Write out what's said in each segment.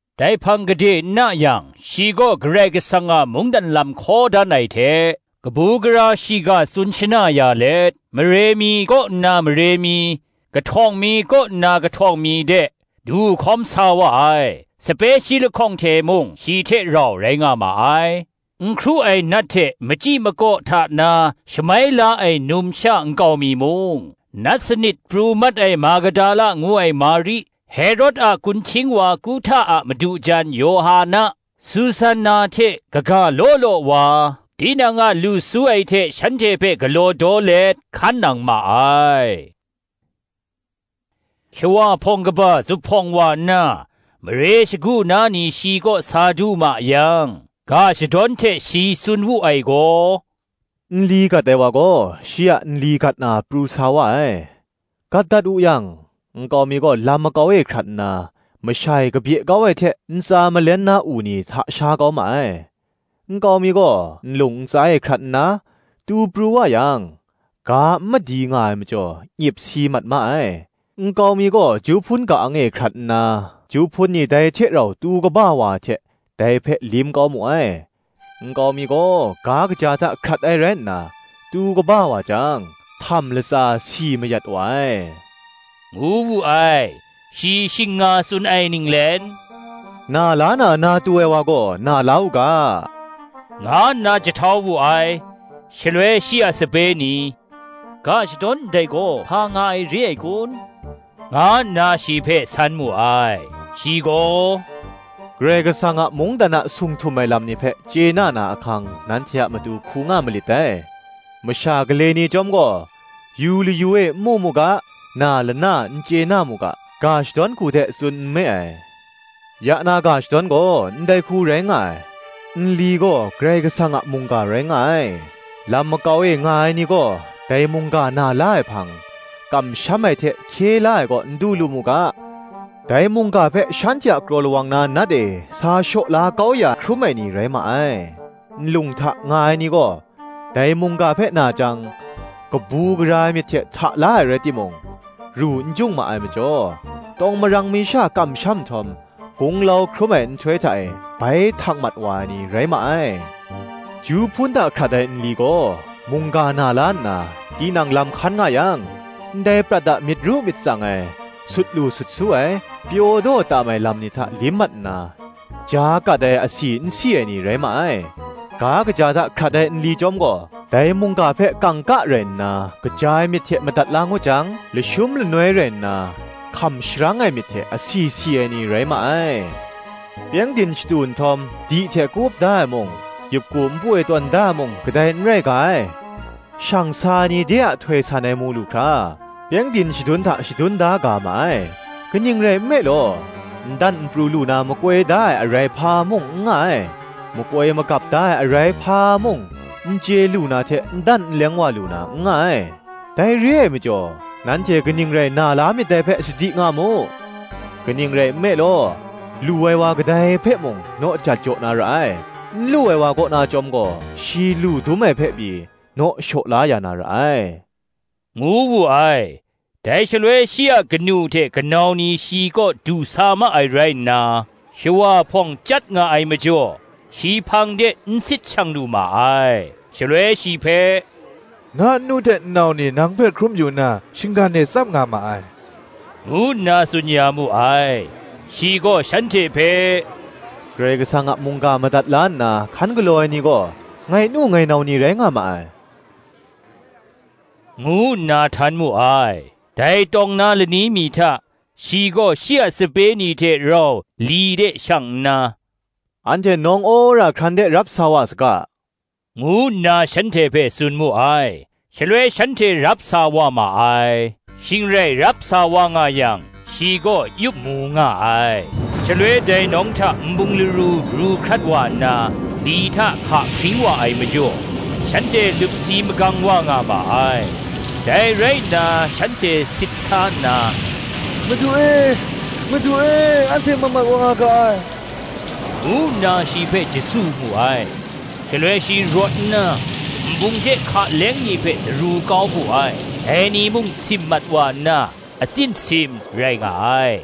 Dai hpang gade n na yang, shi gaw Karai Kasang a mungdan lam hkaw dan ai hte, kabu gara shiga tsun shana ya let, mare mi kaw nna mare mi, kahtawng mi kaw nna kahtawng mi de, du hkawm sa wa ai: sape shi lahkawng hte mung shi hte rau rai nga ma ai; n hkru ai nat hte machyi makaw hta na shamai la ai numsha nkau mi mung, nat sanit pru mat ai Magdala ngu ai Mari, Herod a kunhting wa Kuhta a madu jan Yawhana, Susanna hte kaga law law wa, tinang a lu su ai hte shanhte hpe galaw daw let, hkan nang ma ai. Shawa hpawng kaba zuphpawng wa nna, mare shagu na ni shi kaw sa du ma yang, ga shadawn hte shi tsun wu ai gaw, Nli gat ai wa gaw shi a nli gat na pru sa wa ai; gat dat wu yang, nkau mi gaw lam makau e hkrat nna, masha e kabye kau ai hte, ntsa malen na u ni hta sha kau ma ai. Nkau mi gaw nlung ntsa e hkrat nna, tu pru wa yang, ga n madi nga ai majaw, nyip si mat ma ai. Nkau mi gaw ju hpun ka-ang e hkrat nna, ju hpun ni dai hte rau tu kaba wa ai hte, dai hpe lim kau mu ai. Nkau mi gaw ga kaja hta hkrat ai rai nna, tu kaba wa jang, htam latsa si mayat wa ai, ngu wu ai: shi shing nga tsun ai ninglen, Na la na, na tu ai wa gaw, na la u ga, nga nna jahtau wu ai. Shaloi shi a sape ni, ga shadawn ndai gaw hpa nga ai re ai kun? nga nna shi hpe san mu ai. Shi gaw, Karai Kasang a mungdan a sung htum ai lam ni hpe chye na na ahkang nanhte a matu hku nga malit dai: masha gale ni chyawm gaw, yu layu e n mu mu ga, na lana n chye na mu ga, ga shadawn hku hte tsun nme ai. Ya na ga shadawn gaw ndai hku rai nga ai: Nli gaw Karai Kasang a mungga rai nga ai. Lam makau e nga ai ni gaw, dai mungga na la ai hpang, kamsham ai hte hkye la ai kaw n du lu mu ga, dai mungga hpe shanhte a kraw lawang na Nat e sa shaw la kau ya hkrum ai ni rai ma ai. Nlung hta nga ai ni gaw, dai mungga hpe na jang, kabu gara ai myit hte hta la ai rai timung, ru n jung ma ai majaw, tawng marang mi sha kamsham nhtawm, gunglau hkrum ai nhtoi hta e bai htak mat wa ai ni rai ma ai. Ju hpun hta hkrat ai nli gaw, mungga na la nna, tinang lam hkan nga yang, ndai prat a myit ru myit tsang ai, sut lu sut su ai, pyaw daw tam ai lam ni hta lim mat nna, ja kat ai asi n si ai ni rai ma ai. Ga kaja hta hkrat ai nli chyawm gaw, dai mungga hpe kangka rai nna kaja ai myit hte madat la ngut jang, lashum lanoi rai nna hkam sharang ai myit hte asi si ai ni rai ma ai. Pyengdin shatu nhtawm, di hte ka-up da ai mung, yup ku npu e tawn da ai mung, kadai n rai ga ai: shang sa ai ni de a htoi san ai mu lu hkra, pyengdin shadun hta shadun da ga ma ai: kaning rai nme law, n dan n pru lu na makoi da ai arai hpa mung n nga ai; makoi magap da ai arai hpa mung, n chye lu na hte n dan n leng wa lu na, n nga ai. Dai re ai majaw, nanhte kaning rai na la myit dai hpe sadi nga mu: kaning rai nme law, lu ai wa kadai hpe mung, naw jat jaw na ra ai; n lu ai wa kaw na chyawm gaw, shi lu dum ai hpe pyi, naw shaw la ya na ra ai, ngu wu ai. Dai shaloi shi a kanu hte kanau ni shi kaw du sa ma ai rai nna, shawa hpawng chyat nga ai majaw, shi hpang de n sit shang lu ma ai. Shaloi shi hpe, Na nnu hte nnau ni nang hpe hkrum mayu nna, shinggan e tsap nga ma ai, ngu nna tsun ya mu ai. Shi gaw shanhte hpe, Karai Kasang a mungga madat la nna hkan galaw ai ni gaw, ngai nu, ngai nau ni rai nga ma ai, ngu nna htan mu ai. Dai tawng na lani mi hta, shi gaw shi a sape ni hte rau li de shang nna, Anhte nawng wora hkran de rap sa wa saga, ngu nna shanhte hpe tsun mu ai: shaloi shanhte rap sa wa ma ai. Shing rai rap sa wa nga yang, shi gaw yup mu nga ai. Shaloi dai nawng hta nbung laru ru hkrat wa nna, li hta hka hpring wa ai majaw, shanhte lup si magang wa nga ma ai. Dai rai nna shanhte sit sa nna, Madu e, madu e, anhte mat mat wa nga ga ai, ngu nna shi hpe jasu mu ai. Shaloi shi rawt nna, nbung hte hka leng ni hpe daru kau wu ai: dai ni mung sim mat wa nna, atsin sim rai nga ai.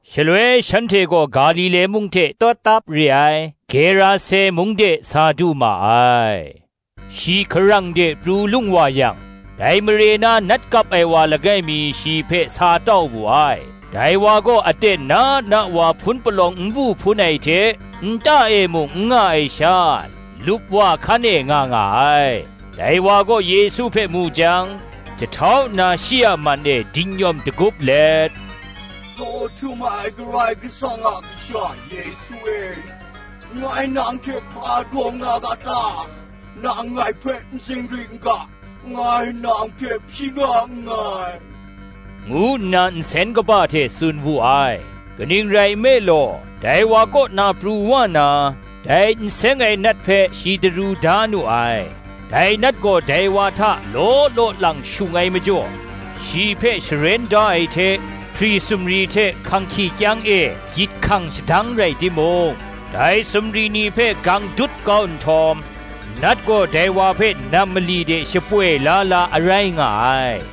Shaloi shanhte gaw Galile mung hte tawtap re ai, Gerase mung de sa du ma ai. Shi hkarang de pru lung wa yang, dai mare na nat kap ai wa langai mi shi hpe sa tau wu ai: dai wa gaw aten na na wa hpun palawng n bu hpun ai hte, nta e mung n nga ai sha, lupwa hkan e nga nga ai. Dai wa gaw Yesu hpe mu jang, jahtau nna shi a man e dingnyawm dagup let, Tsaw htum ai Karai Kasang a Kasha Yesu e, ngai nang hte hpa daw nga ga ta? nang ngai hpe n zingri n ga, ngai nang hpe hpyi nga nngai, ngu nna nsen kaba hte tsun wu ai. Kaning rai nme law, dai wa kaw na pru wa na, dai n seng ai nat hpe shi daru da nu ai. Dai nat gaw dai wa hta law law lang shung ai majaw, shi hpe sharen da ai hte, hpri sumri hte hkang hkyihkyang e gyit hkang shadang rai timung, dai sumri ni hpe gang dut kau nhtawm, nat gaw dai wa hpe nam mali de shapoi la la a rai nga ai.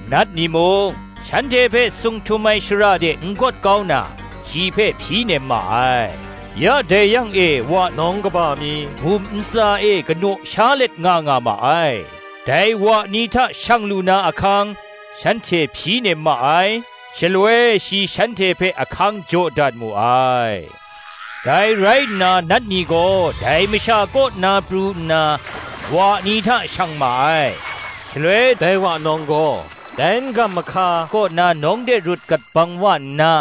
Nat ni mung, shanhte hpe sung htum ai shara de n gawt kau na, shi hpe hpyi nem ma ai. Ya dai yang e wa nawng kaba mi bum ntsa e kanaw sha let nga nga ma ai: dai wa ni hta shang lu na ahkang, shanhte hpyi nem ma ai: shaloi shi shanhte hpe ahkang jaw dat mu ai. Dai rai nna nat ni gaw dai masha kaw na pru nna, wa ni hta shang ma ai: shaloi dai wa nawng gaw dai n-gam mahka kaw na nawng de rut gat bang wa nna,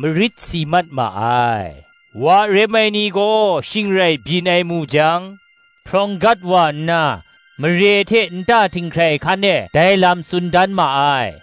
marit si mat ma ai. Wa rem ai ni gaw shing rai byin ai mu jang, hprawng gat wa nna, mare hte nta htinghkrai hkan e dai lam tsun dan ma ai.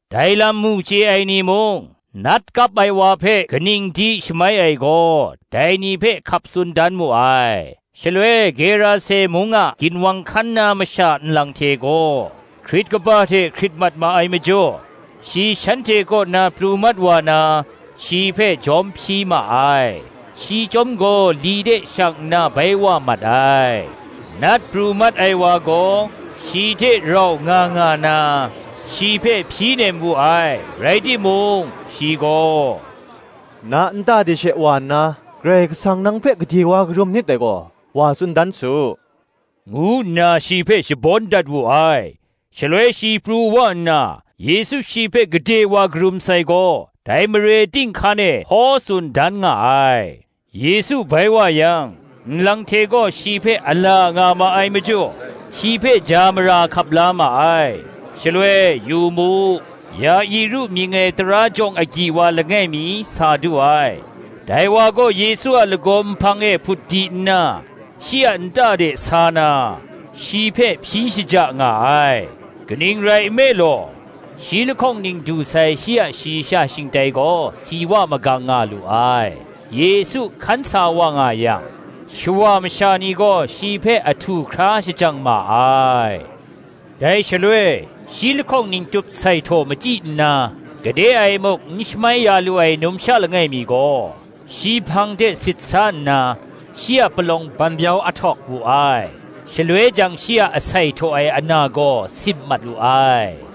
Dai lam mu chye ai ni mung, nat kap ai wa hpe kaning di shamai ai gaw, dai ni hpe hkap tsun dan mu ai. Shaloi Gerase mung a ginwang hkan na masha nlang hte gaw, hkrit kaba hte hkrit mat ma ai majaw, shi shanhte kaw na pru mat wa na, shi hpe jawm hpyi ma ai: shi chyawm gaw li de shang nna bai wa mat ai. Nat pru mat ai wa gaw, shi hte rau nga nga na, shi hpe hpyi nem wu ai: rai timung, shi gaw, Na nta de she wa nna, “Karai Kasang nang hpe gade wa karum nit dai gaw, wa tsun dan su,” ngu nna shi hpe shabawn dat wu ai: shaloi shi pru wa nna, Yesu shi hpe gade wa karum sai gaw, dai mare ting hkan e hkaw tsun dan nga ai. Yesu bai wa yang, nlang hte gaw shi hpe a la nga ma ai majaw, shi hpe ja mara hkap la ma ai. Shaloi, yu mu, Ya-iru mying ai tara jawng agyi wa langai mi sa du ai: dai wa gaw Yesu a lagaw nhpang e hput di nna, shi a nta de sa na, shi hpe hpyi shaja nga ai: kaning rai nme law, shi lahkawng ning du sai shi a shayi sha shingtai gaw si wa magang nga lu ai: Yesu hkan sa wa nga yang, shawa masha ni gaw shi hpe ahtu hkra shajang ma ai. Dai shaloi, shi lahkawng ning tup sai htaw machyi nna, gade e muk n shamai ya lu ai numsha langai mi gaw, shi hpang de sit sa nna, shi a palawng banbyau ahtawk wu ai: shaloi jang shi a sai htaw ai ana gaw sim mat lu ai.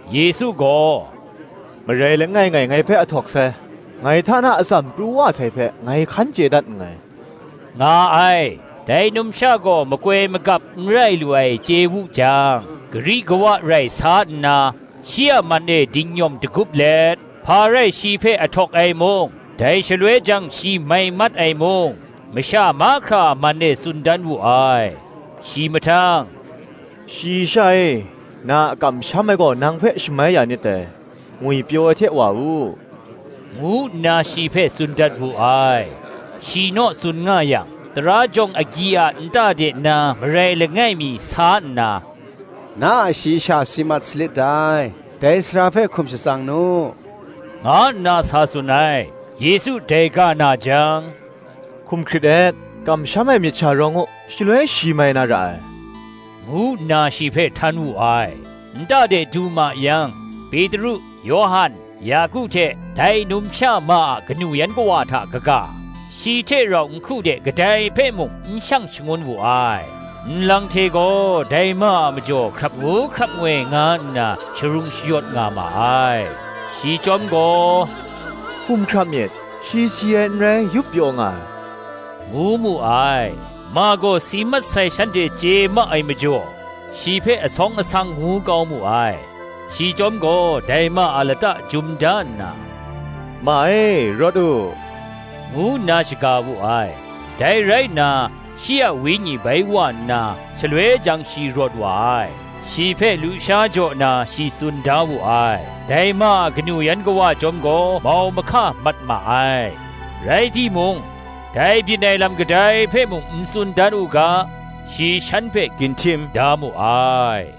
Yesu gaw, “Marai langai ngai, ngai hpe ahtawk sai: ngai hta na atsam pru wa sai hpe ngai hkan chye dat nngai,” nga ai. Dai numsha gaw makoi magap n rai lu ai chye wu jang, gari kawa rai sa nna, shi a man e dingnyawm dagup let, hpa rai shi hpe ahtawk ai mung, dai shaloi jang shi mai mat ai mung, masha mahkra a man e tsun dan wu ai. Shi mahtang, “Shayi sha e, na a kamsham ai gaw nang hpe shamai ya nit dai; ngwipyaw ai hte wa u,” ngu nna shi hpe tsun dat wu ai. Shi naw tsun nga yang, Tara jawng agyi a nta de na marai langai mi sa nna, “Na a shayi sha si mat salit dai; dai sara hpe hkum shatsang nu,” nga nna sa tsun ai. Yesu dai ga na jang, “Hkum hkrit et; kamsham ai myit sha rawng u, shaloi shi mai na ra ai,” ngu nna shi hpe htan wu ai. Nta de du ma yang, Petru, Yawhan, Yaku hte, dai numsha ma a kanu yan kawa hta kaga, shi hte rau nhku de kadai hpe mung n shang shangun wu ai. Nlang hte gaw dai ma a majaw hkrap ngu hkrap ngoi nga nna sharung shayawt nga ma ai. Shi chyawm gaw, “Hkum hkrap myit, shi si ai n rai, yup pyaw nga ai,” ngu mu ai. Ma gaw si mat sai shanhte chye ma ai majaw, shi hpe asawng asang ngu kau mu ai. Shi chyawm gaw dai ma a lata jum da nna, “Ma e, rawt u,” ngu nna shaga wu ai. Dai rai nna, shi a wenyi bai wa nna, shaloi jang shi rawt wa ai; shi hpe lusha jaw na shi tsun da wu ai. Dai ma a kanu yan kawa chyawm gaw mau mahka mat ma ai: rai timung, dai byin ai lam kadai hpe mung n tsun dan u ga, shi shan hpe ginhtim da mu ai.